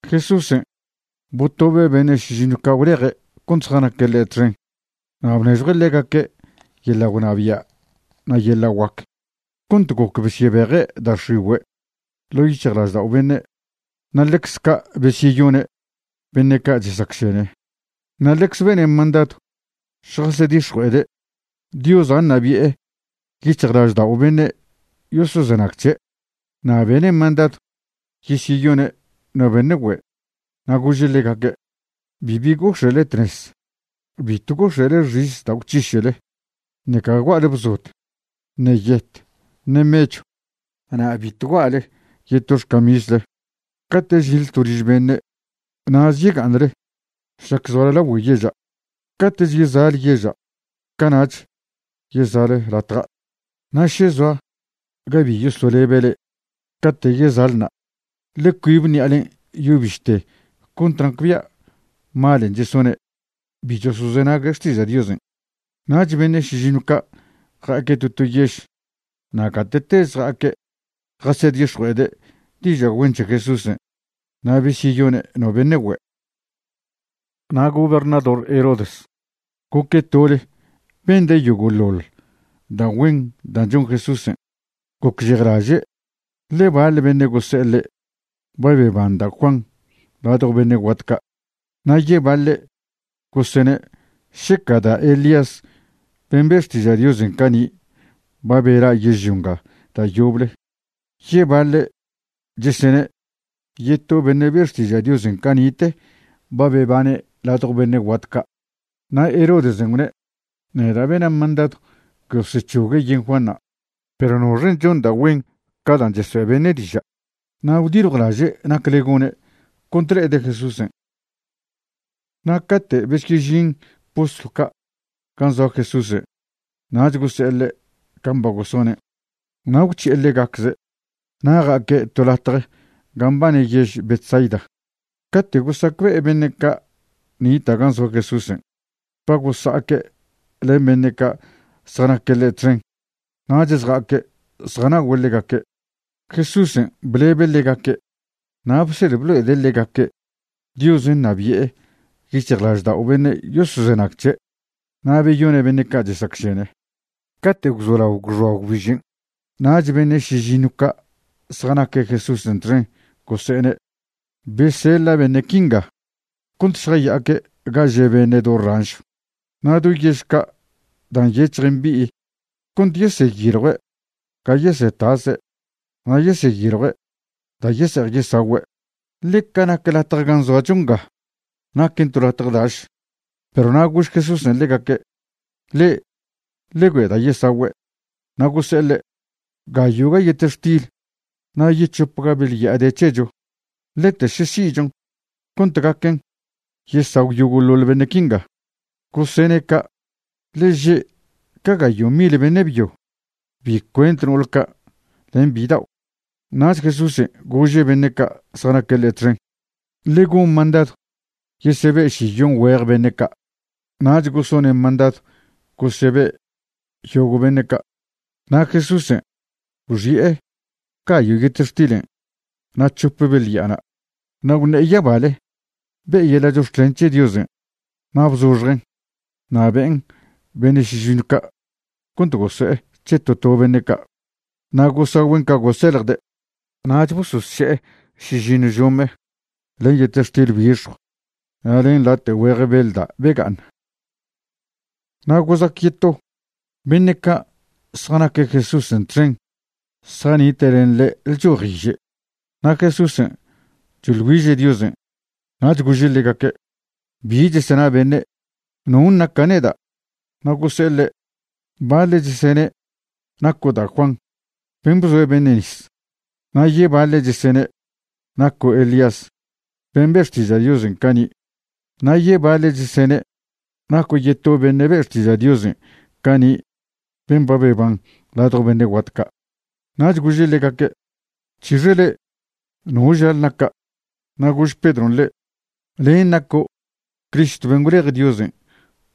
Jesúsen' botobe' beṉe' šižiṉw ca' gwleje' cont zjanaque' ḻe' txen na' bnežjue' ḻegaque' yeḻa' gwnabia' na' yeḻa' guac cont goc besyebeje' da' x̱igüe' ḻo' yic̱hjlaždao' beṉe', na' ḻecze ca' besyeyone' beṉe' ca' chesacšene. Na' ḻecze bene' mandadw šjasedix̱jue'ede' Diosa' ṉabi'e yic̱hjlaždao' beṉe' yosozenag c̱he'. Na' bene' mandadw yesyeyone' no beṉe' güe'. Na' gože' ḻegaque': ―Bibi gox̱e'le tnez. Bitw gox̱e'le xis da' gwc̱hiše'le, ṉeca gua'le bzod, ṉe yet, ṉe mechw, na' bitw gua'le yeto xcamisle. Cate' žinḻe to liž beṉe', na'ze yega'aṉle šlac zoale lagüe yeža'; cate'ch yeza'le yeža', cana'ch yeza'le latja'. Na' še zoa ga bi yosolebe' le'e, cate' yeza'le na', ḻe cuibe ṉi'alen' yo bište cont nacbia' malen' chesone' bi chosozenague' xtiža' Diosen'. Nach beṉe' šižiṉw ca' ja'aque' to to yež, na' gate'teze ja'aque' jasedix̱jue'ede' diža' güen c̱he Jesúsen' na' besyeyone' no beṉe' güe'. Na' gobernador Herodes goque' tole bende' yogo'ḻoḻ da' güen da' chon Jesúsen'. Gocžejlaže', ḻe baḻ beṉe' gose'e ḻe' ba beban da' Juan ladjo beṉe' guat ca'. Na' yebaḻe' gosene' šeca da' Elías ben' be' xtiža' Diosen' cani' ba bela' yežlio nga da' yoble. Yebaḻe' chesene' yeto beṉe' be' xtiža' Diosen' cani'te ba bebane' ladjo beṉe' guat ca'. Na' Herodesen' gwne': ―Neda' bena' mandadw gosec̱hogue' yen Juanṉa', perw ¿noxen' chon da' güen ca dan' chesoe' beṉe' diža'? Na' gwdiljwlaže' nacle gone' cont le'ede' Jesúsen'. Na' cate' besyežin postlw ca' gan' zoa Jesúsen' nach gose'e ḻe' can' ba gosonen'. Na' gwc̱hi'e ḻegacze' na' ja'aque' to latje gan' mbane yež Betsaida. Cate' gosacbe'e beṉe' ca' nita' gan' zoa Jesúsen' ba gosa'aque' len beṉe' ca' zjanaque' ḻe' txen, nach zja'aque' zjana'ogüe' ḻegaque'. Jesúsen' blebe' ḻegaque' na' bsed blo'ede' ḻegaque' Diosen' ṉabi'e yic̱hjlaždao' beṉe' yosozenag c̱he', na' beyone' beṉe' ca' chesacšene. Cate' gwzolao gwxoa gwbižen', nach beṉe' šižiṉw ca' zjanaque' Jesúsen' txen gose'ene': ―Beseḻa' beṉe' quinga cont šjaya'aque' ga že' beṉe' do ranšw na' do yež ca' dan' nyec̱hj mbi'i cont yeseyiljue' ga yesetase' na' yeseyiljue' da' yese'ej yesagüe', ḻe ca nac latje gan' zoacho nga, naquen to latje daš. Perw na' gož Jesúsen' ḻegaque': ―Le'e ḻe güe'e da' yesagüe'. Na' gose'e ḻe': ―Gayo'ga yetextil na' yec̱hopga beḻ ya'a de c̱hecho, lete še si'chon cont gaquen yesagw yogo'ḻoḻ beṉe' quinga. Gosene' ca' ḻe že' ca gayo' mil beṉe' byo, bi cuent no'ol ca' len bidao'. Nach Jesúsen' gože' beṉe' ca' zjanaque' ḻe' txen: ―Ḻe gon mandadw yesebe' šiyon güej beṉe' ca'. Nach gosone' mandadw gosebe' yogo' beṉe' ca', na' Jesúsen' gwxi'e gayo' yetextilen' na' c̱hope beḻ ya'ana', na' gwṉe'e yabale, be'e yeḻa' chox̱clen c̱he Diosen' na' bzoxjen' na' be'en beṉe' šižiṉw ca' cont goso'e c̱he to to beṉe' ca'. Na' gosagüen' ca goseḻjde'. Nach bososše'e šižiṉw žome len yetextil bixjw na' len late' güeje beḻ da' bega'aṉ. Na' gozac yeto, beṉe' ca' zjanaque' Jesúsen' txen zjanite' len ḻe' lchojiže, na' Jesúsen' choḻ güiže' Diosen'. Nach gože' ḻegaque': ―¿Bi chesena beṉe'? ¿Non' naca' neda'? Na' gose'e ḻe': ―Baḻe' chesene' naco' da' Juan ben' bzoe' beṉe' nis. Na' yebaḻe' chesene' naco' Elías ben' be' xtiža' Diosen' cani'. Na' yebaḻe' chesene' naco' yeto beṉe' be' xtiža' Diosen' cani' ben' ba beban ladjo beṉe' guat ca'. Nach gože' ḻegaque': ―¿C̱hixe le'e? ¿No žale naca'? Na' gož Pedron' ḻe': ―Len' naco' Cristo ben' gwlej Diosen'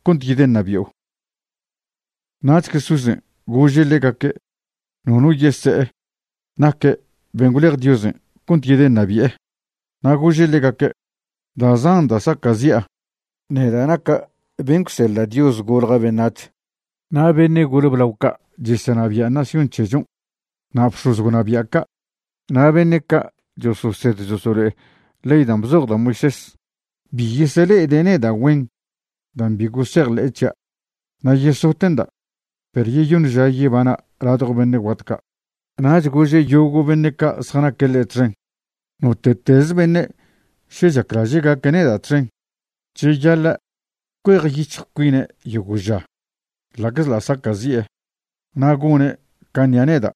cont yedeṉabi'o. Nach Jesúsen' gože' ḻegaque' nono yese'e naque' ben' gwlej Diosen' cont yedeṉabi'e. Na' gože' ḻegaque': ―Da' zan da' saca'zi'a, neda' naca' ben' gwseḻa' Dios golja' beṉac̱h. Na' beṉe' gole blao ca' chesenabia' nación c̱hechon' na' bx̱oz gwnabia' ca', na' beṉe' ca' chososed chosolo'e ley dan' bzoj da' Moisés, bi yesele'ede' neda' güen dan' bi gosejḻe'e c̱hia', na' yesote'nda', perw yeyoṉ ža yebana' ladjo beṉe' guat ca'. Nach gože' yogo' beṉe' ca' zjanaque' ḻe' txen: ―Note'tez beṉe' še chaclaže' gaque' neda' txen, cheyaḻa' cuejyic̱hj cuine' yogo' ža, ḻa'czḻa' saca'zi'e, na' gone' can' ṉia' neda'.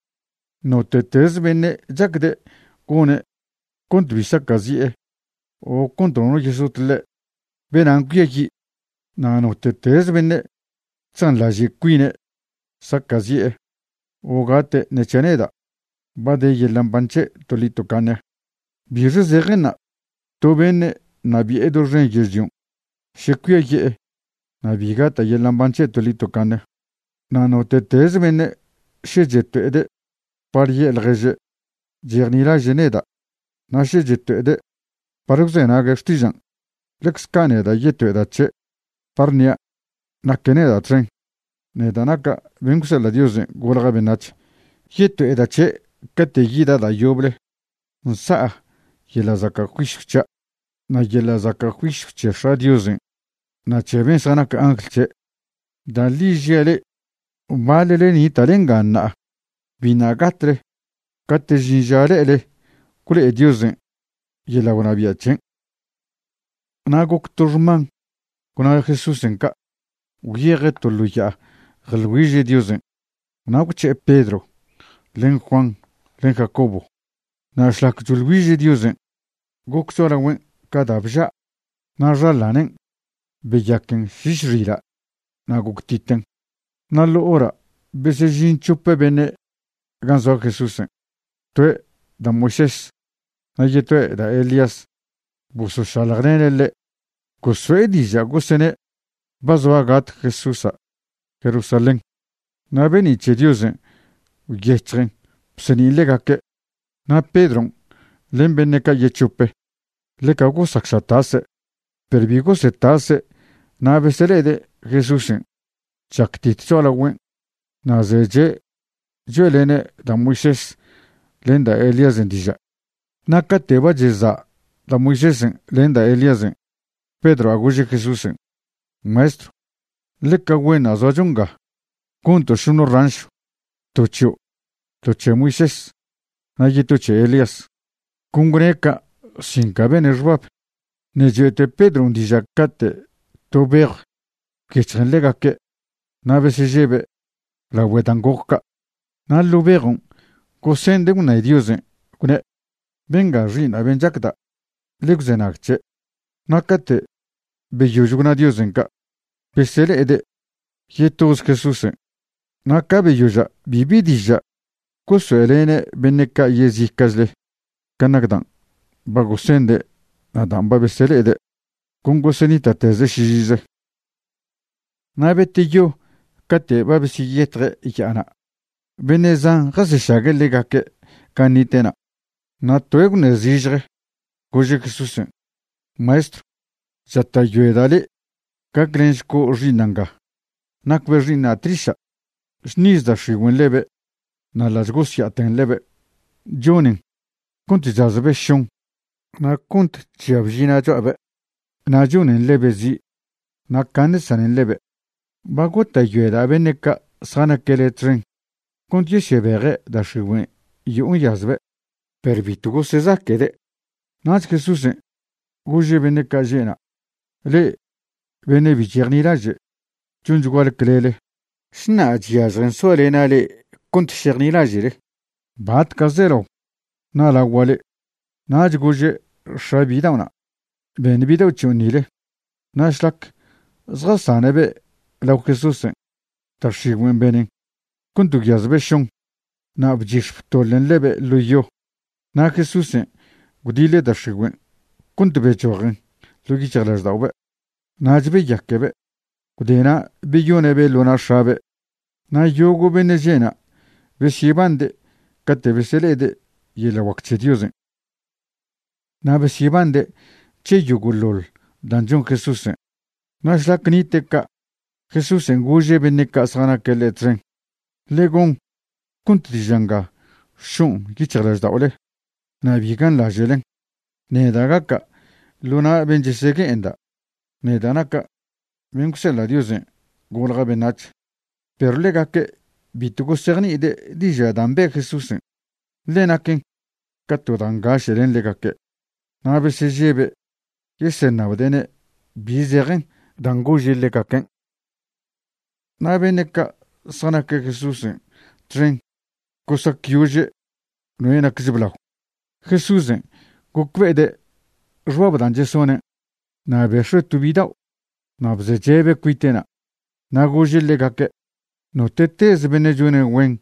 Note'tez beṉe' chacde' gone' cont bi saca'zi'e o cont nono yesot ḻe', benan' cuiayi'. Na' note'teze beṉe' chzanḻaže' cuine' saca'zi'e o gate' ṉe c̱hia' neda', ba de yeḻa' mban c̱he' toḻi tocaṉe. ¿Bixe zejenṉa' to beṉe' ṉabi'e doxen yežlion' še cuiaye'e na' bi gata' yeḻa' mban c̱he' toḻi tocaṉe? Na' note'tez beṉe' še cheto'ede' par ye'e ḻježe' chejnilaže' neda' na' še cheto'ede' par gwzenague' xtižan', ḻecze ca' neda' yeto'eda' c̱he' par ṉia' naque' neda' txen, neda' naca' ben' gwseḻa' Diosen' golja' beṉac̱h. Yeto'eda' c̱he' cate' yida' da' yoble nsa'a yeḻa' zaca' juisyw c̱hia' na' yeḻa' zaca' juisyw c̱he X̱a' Diosen' na' c̱he ben' zjanac angl c̱he'. Da' ḻi žia' le'e, baḻle nita'le nga ṉa'a biṉa' gatle cate' žin ža le'ele gwlo'e Diosen' yeḻa' gwnabia' c̱hen'. Nag goc to xman gwna Jesúsen' ca', gwyeje' to ḻo ya'a jeḻ güiže' Diosen' na' gwc̱he'e Pedro len Juan len Jacobo. Na' šlac choḻ güiže' Diosen' goc cho'alagüen' ca da' bža'. Na' xaḻanen' beyaquen šiš xila' na' goctiten. Na' ḻo hora' besežin c̱hop beṉe' gan' zoa Jesúsen', toe' da' Moisés na' yetoe' da' Elías bosošaljlene' ḻe'. Goso'e diža' gosene' ba zoa gat Jesúsa' Jerusalén. Na' be'ni' c̱he Diosen' gwyec̱hjen bseṉin' ḻegaque'. Na' Pedron' len beṉe' ca' yec̱hope ḻeca gosac ša tase' perw bi gosetase' na' besele'ede' Jesúsen' chactit cho'alagüen' na' zeche' choe'lene' da' Moisésen' len da' Elíasen' diža'. Na' cate' ba cheza' da' Moisésen' len da' Elíasen', Pedroa' gože' Jesúsen': ―¡Maestrw, ḻeca güenṉa' zoacho nga! Gonto' šoṉe ranšw, to c̱hio', to c̱he Moisés, na' yeto c̱he Elías. Con gwne' ca' sin ca bene' xbab. Ṉe' choe'te Pedron' diža' cate' to bejw gwyec̱hjen ḻegaque' na' besežebe' lagüe dan' goc ca'. Na' ḻo' bejon' gosende' gwṉe Diosen', gwne': ―Benga Xi'iṉa' ben chacda'. Ḻe gwzenag c̱he'. Na' cate' beyož gwna Diosen' ca', besele'ede' yetoze Jesúsen'. Na' ca' beyoža' bibi diža' gosoe'lene' beṉe' ca' yezica'chle can' nac dan' ba gosende' na' dan' ba besele'ede'. Con gosenita'teze' šižize. Na' beteyo cate' ba besyeyetje' ya'ana' beṉe' zan jasešague' ḻegaque' gan' nite'na'. Na' toe' gwṉe' zižje, gože' Jesúsen': ―Maestrw, chata'yoeda' le' gaclenšco' xi'iṉa' nga. Nacbe' xi'iṉa' tliša'. Chṉiz da' x̱igüen' ḻebe' na' ḻa' chgosya'aten ḻebe', chonen cont chazbe' šon na' cont chžia bžina' cho'abe' na' chonen ḻebe' zi', na' caṉe chsanen ḻebe'. Ba gota'yoeda' beṉe' ca' zjanaque' le' txen cont yesyebeje' da' x̱igüen' yo'o nyazbe', perw bitw gosezaque'de'. Nach Jesúsen' gože' beṉe' ca' že' na': ―¡Le'e beṉe' bi chejnilaže', chonchguale clele! ¿Šna chyažjen soalena' le'e cont šejnilaže'le? ¿Batca' zelao ṉa'lagua' le'e? Nach gože' x̱a bidao'na': ―Beṉ bidao' c̱hion' nile. Na' šlac zjasane'be' lao Jesúsen', da' x̱igüen' benen cont gwyazbe' šon, na' bchix̱ btoḻen ḻebe' ḻo yo. Na' Jesúsen' gwdiḻe' da' x̱igüen' cont bechojen ḻo' yic̱hjlažda'obe'. Nach beyaquebe'. Gwdena' beyoṉe'be' ḻo na' x̱abe'. Na' yogo' ben' že'na' besyebande' cate' besele'ede' yeḻa' guac c̱he Diosen'. Na' besyebande' c̱he yogo'ḻoḻ dan' chon Jesúsen', na' šlac nite' ca', Jesúsen' gože' beṉe' ca' zjanaque' ḻe' txen: ―Ḻe gon cont diža' nga šo'on yic̱hjlažda'ole, na' bi ganḻaže'len. Neda' gaca' ḻo na' ben' chesegue'enda', neda' naca' ben' gwseḻa' Diosen' golja' beṉac̱h. Perw ḻegaque' bitw gosejni'ide' diža' dan' be' Jesúsen', ḻe naquen ca to da' ngaše' len ḻegaque'. Na' besežebe' yeseṉabde'ne' bi zejen dan' gože' ḻegaquen'. Na' beṉe' ca' zjanaque' Jesúsen' txen gosacyože' noe' nacch blao. Jesúsen' gocbe'ede' xbab dan' chesonen', na' bex̱ue' to bidao' na' bzeche'be' cuite'na' na' gože' ḻegaque': ―Note'teze beṉe' chone' güen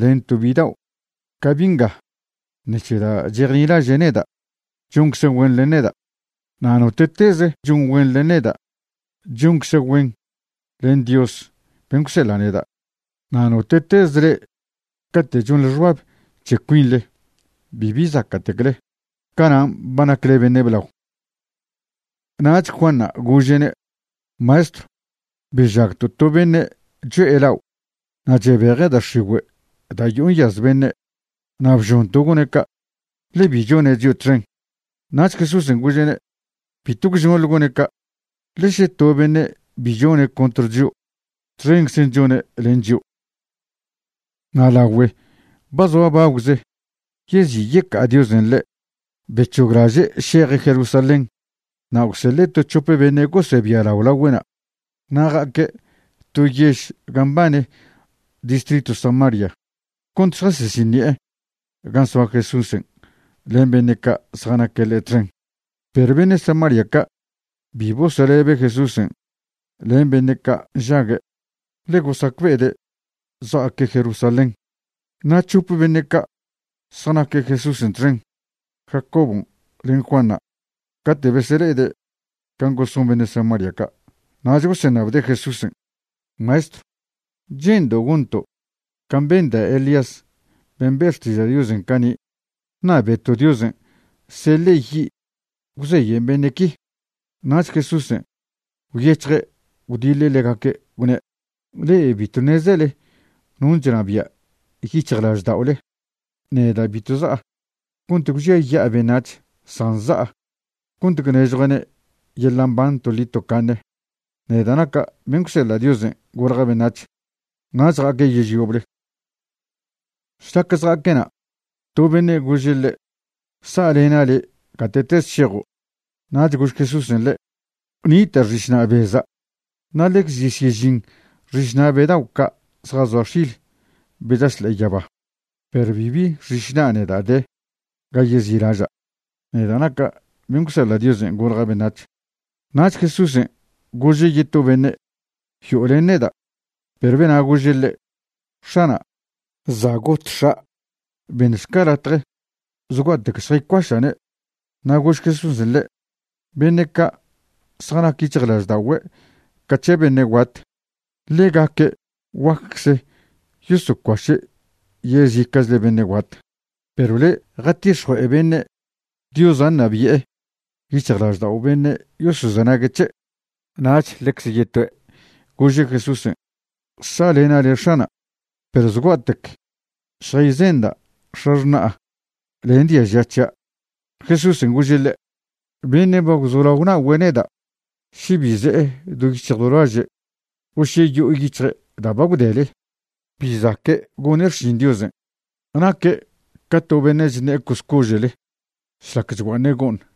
len to bidao' ca bi' nga ṉec̱he da' chejnilaže' neda', choncze' güen len neda'. Na' note'teze chon güen len neda' choncze' güen len Dios ben' gwseḻa' neda'. Na' note'tez le'e cate' chonḻe xbab c̱he cuinḻe bibi zaca'tecle, canan' ba nacle beṉe' blao. Nach Juanṉa' gože'ne': ―Maestrw, bežagto' to beṉe' cho'e lao' na' chebeje' da' x̱igüe' da' yo'o nyaz beṉe'. Na' bžonto' gone' ca', ḻe bi chone' chio' txen. Nach Jesúsen' gože'ne': ―Bitw gwžonḻe gone' ca', ḻe še to beṉe' bi chone' contr chio', txenczen' chone' len chio'. Na' lagüe' ba zoa bagwze yezi' yeca'a Diosen' ḻe', bec̱hoglaže' šeje' Jerusalén. Na' gwseḻe' to c̱hope beṉe' gosebialao lagüe'na'. Na' ja'aque' to yež gan' mbane distritw Samaria cont šjasesiṉi'e gan' soa Jesúsen' len beṉe' ca' zjanaque' ḻe' txen. Perw beṉe' Samaria ca' bi bosolebe' Jesúsen' len beṉe' ca' nžague', ḻe gosacbe'ede' zja'aque' Jerusalén. Na' c̱hope beṉe' ca' zjanaque' Jesúsen' txen, Jacobon' len Juanṉa', cate' besele'ede' can' goson beṉe' Samaria ca', nach goseṉabde' Jesúsen': ―Maestrw, ¿che'ndo' gonto' can' ben da' Elías ben' be' xtiža' Diosen' cani', ṉabeto' Diosen' seḻe' yi' gwzeyen beṉe' qui? Nach Jesúsen' gwyec̱hje' gwdiḻe' ḻegaque' gwne': ―Le'e bitw ṉezele non' chnabia' yic̱hjlažda'ole. Neda' bitw za'a cont gwžiaya'a beṉac̱h, san za'a cont gwnežjua'ne' yeḻa' mban toḻi tocaṉe, neda' naca' ben' gwseḻa' Diosen' golja' beṉac̱h. Nach ja'aque' yež yoble. Šlac zja'aque' na', to beṉe' gože' ḻe': ―Sa'lena' le' gate'teze šejo'. Nach gož Jesúsen' ḻe': ―Nita' xišna' beza' na' ḻecz chesyežin xišna' be dao' ca' zjazoa x̱il be chaš ḻe'e yaba, perw bibi xišna' neda' de ga yezi'laža', neda' naca' ben' gwseḻa' Diosen' golja' beṉac̱h. Nach Jesúsen' gože' yeto beṉe': ―Yo'o len neda'. Perw bena' gože' ḻe': ―X̱ana', za' got x̱a'. Beṉšca latje zgua'tec šjaycuaša'ne'. Na' gož Jesúsen' ḻe': ―Beṉe' ca' zjanac yic̱hjlažda'ogüe' ca c̱he beṉe' guat, ḻegaque' guaccze yosocuaše' yezica'chle beṉe' guat. Perw le', jatix̱jue'e beṉe' Diosa' ṉabi'e yic̱hjlaždao' beṉe' yosozenague' c̱he'. Nach ḻecze yetoe' gože' Jesúsen': ―Sa'lena' le' X̱ana', perw zgua'tec šjayzenda' x̱axṉa'a len diaža c̱hia'. Jesúsen' gože' ḻe': ―Beṉe' ba gwzolao nagüe' neda', še bi ze'e do yic̱hj do laže', o še yo'o yic̱hje' da' ba gwdele, bi zaque' gone' xšin Diosen'. Naque' ca to beṉe' chṉe'e coscože'le šlac chgua'aṉe' go'ṉ.